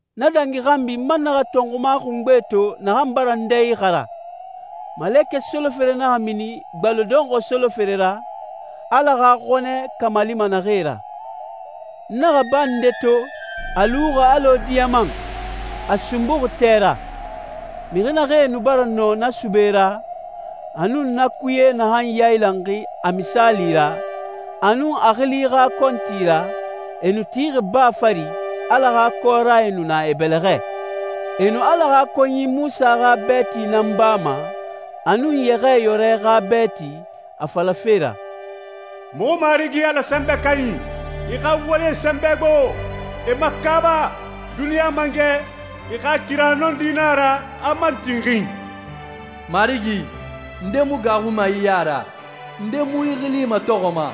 Na dangi xanbi, n man naxa tɔnxuma xungbe to naxan bara n dɛ ixara. Malekɛ solofere naxa mini gbaloe dɔnxɔɛ solofere ra, Ala xa xɔnɛ kamalima naxee ra. N naxa baa nde to, a luxi alɔ diyaman, a sunbuxi tɛ ra. Mixi naxee nu bara nɔ na sube ra, a nun na kuye naxan yailanxi a misaali ra, a nun a xili xa kɔnti ra, e nu tixi baa fari, Ala xa kɔrae nu na e bɛlɛxɛ. E nu Ala xa konyi Munsa xa bɛɛti nan bama, a nun Yɛxɛɛyɔrɛ xa bɛɛti, a falafe ra, «Muxu Marigi Ala Sɛnbɛ Kanyi, i xa walie sɛnbɛ gbo! E makaaba! Duniɲa Mangɛ, i xa kira nɔndi na a ra, a man tinxin. Marigi, nde mu gaaxuma i ya ra? Nde mu i xili matɔxɔma?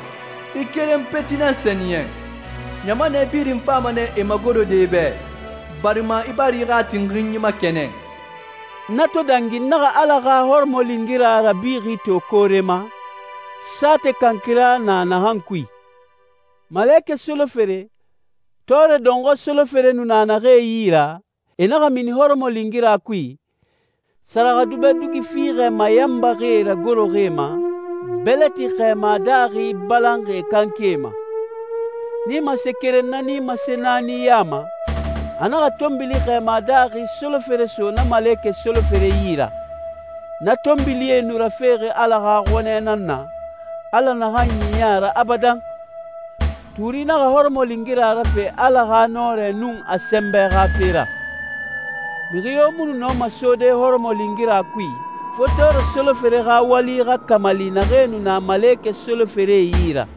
I keren peti nan sɛniyɛn. Ɲamanɛ birin fama nɛ e magorode i bɛ, barima i bara i xa tinxinyi makɛnɛn.» Na to dangi, n naxa Ala xa hɔrɔmɔlingira rabixi to koore ma, saatɛ kankira na naxan kui. Malekɛ solofere, tɔɔrɛ dɔnxɔɛ solofere nu na naxee yi ra, e naxa mini hɔrɔmɔlingira kui, sɛrɛxɛdubɛ dugi fiixɛ mayanbaxie ragoroxi e ma, bɛlɛti xɛɛma daaxi balanxi e kanke ma. Nimase keren na nimase naani ya ma, a naxa tɔnbili xɛɛma daaxi solofere so na malekɛ solofere yi ra. Na tɔnbilie nu rafexi Ala xa xɔnɛ nan na, Ala naxan ɲiɲɛ a ra abadan. Tuuri naxa hɔrɔmɔlingira rafe Ala xa nɔrɛ nun a sɛnbɛ xa fe ra. Mixi yo mu nu nɔma sode hɔrɔmɔlingira kui, fo tɔɔrɛ solofere xa wali xa kamali naxee nu na malekɛ soloferee yi ra.